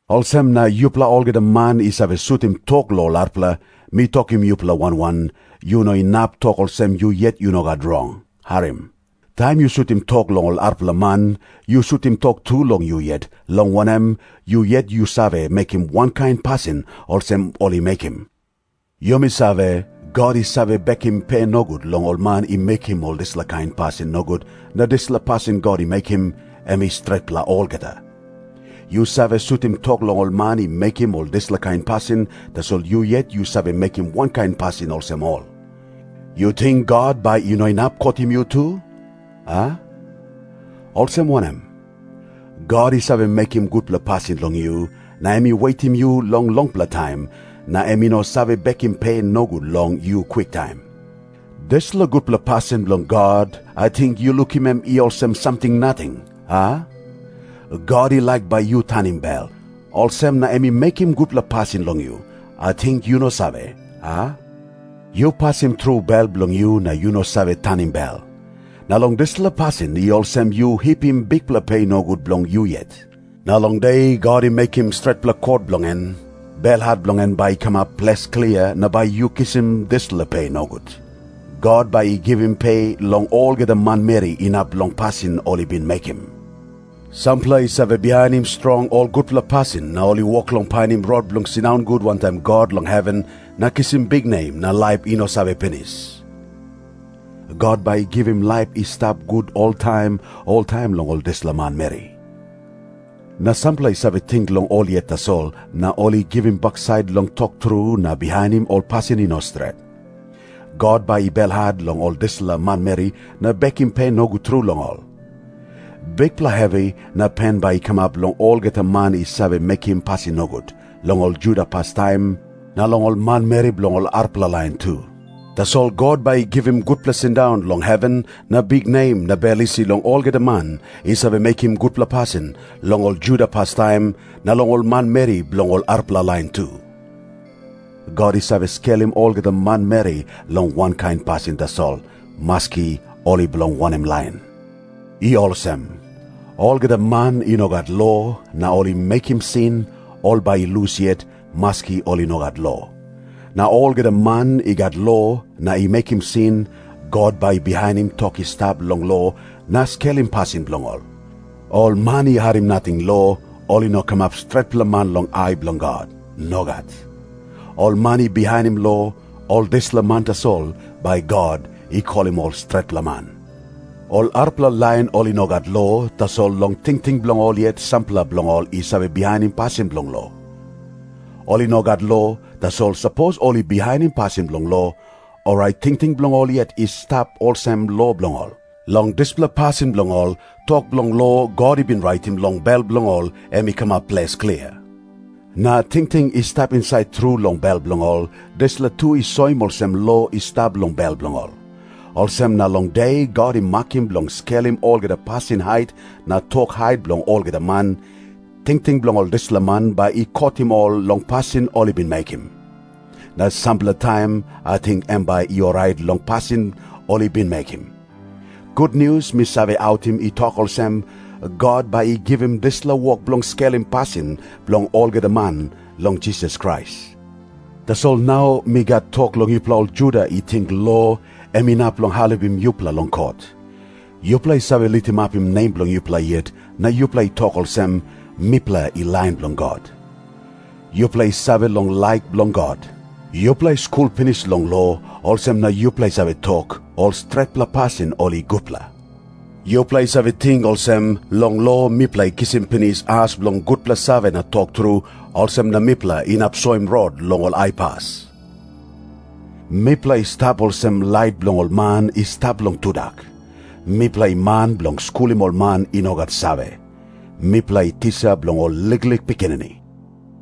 Olsem na yupela olgeta man i save sutim tok long ol arapela, mi tokim yupela wan wan, yu no inap tok olsem yu yet yu no gat rong. Harim. Taim yu sutim tok long ol arapela man, yu sutim tok tu long yu yet, long wanem, yu yet yu save mekim wankain pasin olsem ol i mekim. Yumi save, God i save bekim pe nogut long ol man i mekim ol dispela kain pasin nogut, na dispela pasin God i mekim, em i stretpela olgeta. Yu save sutim tok long ol man i mekim ol dispela kain pasin, tasol yu yet yu save mekim wankain pasin olsem ol. Yu ting God bai i no inap kotim yu tu, a? Olsem wanem? God i save mekim gutpela pasin long yu, na em i wetim yu longpela taim, na em i no save bekim pe nogut long yu kwiktaim. Dispela gutpela pasin bilong God, ating yu lukim em i olsem samting nating, a? God i laik bai yu tanim bel, olsem na em i mekim gutpela pasin long yu. Ating yu no save, a? Yu pasim tru bel bilong yu na yu no save tanim bel. Na long dispela pasin i olsem yu hipim bikpela pe nogut bilong yu yet. Na long de God i mekim stretpela kot bilong en, belhat bilong en bai i kamap ples klia na bai yu kisim dispela pe nogut. God “bai i givim pe long olgeta manmeri inap long pasin ol i bin mekim.” Sampela i save bihainim strong ol gutpela pasin na ol i wok long painim rot bilong sindaun gut wantaim God long heven na kisim biknem na laip i no save pinis. God bai i givim laip i stap gut oltaim oltaim long ol dispela manmeri. Na sampela i save ting long ol yet tasol, na ol i givim baksait long tok tru na bihainim ol pasin i no stret. God bai i belhat long ol dispela manmeri na bekim pe nogut tru long ol. Bikpela hevi na pen bai i kamap long olgeta man i save mekim pasin nogut, long ol Juda pastaim, na long ol manmeri bilong ol arapela lain tu. Tasol God bai i givim gutpela sindaun long heven na biknem na bel isi long olgeta man i save mekim gutpela pasin, long ol Juda pastaim, na long ol manmeri bilong ol arapela lain tu. God i save skelim olgeta manmeri long wankain pasin tasol, maski ol i bilong wanem lain. I olsem. Olgeta man i no gat lo na ol i mekim sin, ol bai i lus yet, maski ol i no gat lo. Na olgeta man i gat lo na i mekim sin, God bai i bihainim tok i stap long lo na skelim pasin bilong ol. Ol man i harim nating lo, ol i no kamap stretpela man long ai bilong God. Nogat. Ol man i bihainim lo, ol dispela man tasol bai God i kolim ol stretpela man. Ol arapela lain ol i no gat lo, tasol long tingting bilong ol yet sampela bilong ol i save bihainim pasin bilong lo. Ol i no gat lo, tasol sapos ol i bihainim pasin bilong lo, orait tingting bilong ol yet i stap olsem lo bilong ol. Long dispela pasin bilong ol, tok bilong lo God i bin raitim long bel bilong ol em i kamap ples klia. Na tingting i stap insait tru long bel bilong ol, dispela tu i soim olsem lo i stap long bel bilong ol. Olsem na long de God i makim bilong skelim olgeta pasin hait na tok hait bilong olgeta man, tingting bilong ol dispela man bai i kotim ol long pasin ol i bin mekim. Na sampela taim ating em bai i orait long pasin ol i bin mekim. Gutnius mi save autim i tok olsem, God bai i givim dispela wok bilong skelim pasin bilong olgeta man long Jisas Krais. Tasol nau mi gat tok long yupela ol Juda i ting lo em inap long helpim yupela long kot. Yupela i save litimapim nem bilong yupela yet na yupela i tok olsem, “Mipela i lain bilong God.” Yupela i save long laik bilong God. Yupela i skul pinis long lo, olsem na yupela i save tok, ol stretpela pasin ol i gutpela. Yupela i save ting olsem, “Long lo mipela i kisim pinis as bilong gutpela save na tok tru, olsem na mipela inap soim rot long ol aipas. Mipela i stap olsem lait bilong ol man i stap long tudak. Mipela i man bilong skulim ol man i no gat save. Mipela i tisa bilong ol liklik pikinini.”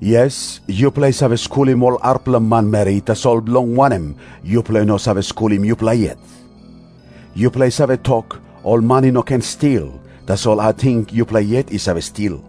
Yes, yupela i save skulim ol arapela manmeri, tasol bilong wanem yupela i no save skulim yupela yet? Yupela i save tok, ol man i no ken stil, tasol ating yupela yet i save stil?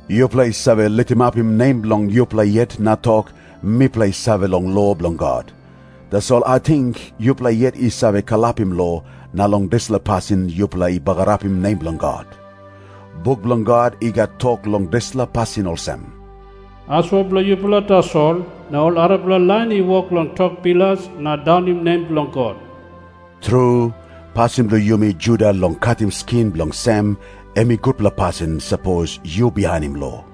Yupela i save litimapim nem bilong yupela yet na tok, “Mipela i save long lo bilong God.” Tasol ating yupela yet i save kalapim lo, na long dispela pasin yupela i bagarapim nem bilong God. Buk bilong God i gat tok long dispela pasin olsem, “Asua bilong yupela tasol, na ol arapela lain i wok long tok bilas na daunim nem bilong God.” Tru, pasin bilong yumi Juda long katim skin bilong sem, em i gutpela pasin, sapos yu bihainim lo.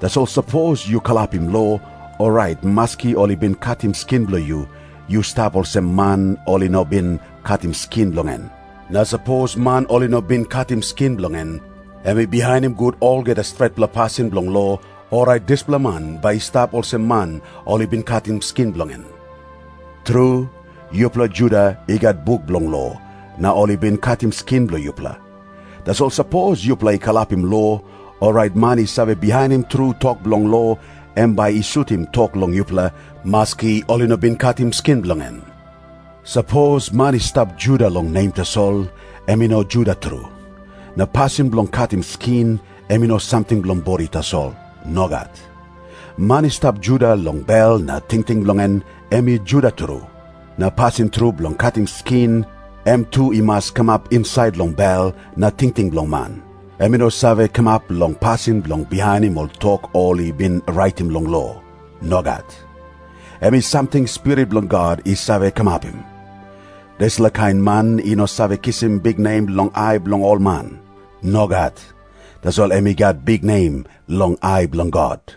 Tasol sapos yu kalapim lo, orait maski ol i bin katim skin bilong yu, yu stap olsem man ol i no bin katim skin bilong en. Na sapos man ol i no bin katim skin bilong en, em i bihainim gut olgeta stretpela pasin bilong lo, orait dispela man bai i stap olsem man ol i bin katim skin bilong en. Tru, yupela Juda i gat buk bilong lo, na ol i bin katim skin bilong yupela. Tasol sapos yupela i kalapim lo, orait man i save bihainim tru tok bilong lo em bai i sutim tok long yupela, maski ol i no bin katim skin bilong en. Sapos man i stap Juda long nem tasol, em i no Juda tru. Na pasin bilong katim skin, em i no samting bilong bodi tasol. Nogat. Man i stap Juda long bel na tingting bilong en, em i Juda tru. Na pasin tru bilong katim skin, em tu i mas kamap insait long bel na tingting bilong man. Em i no save kamap long pasin bilong bihainim ol tok ol i bin raitim long lo. Nogat. Em i samting Spirit bilong God i save kamapim. Dispela kain man i no save kisim biknem long ai bilong ol man. Nogat. Tasol em i gat biknem long ai bilong God.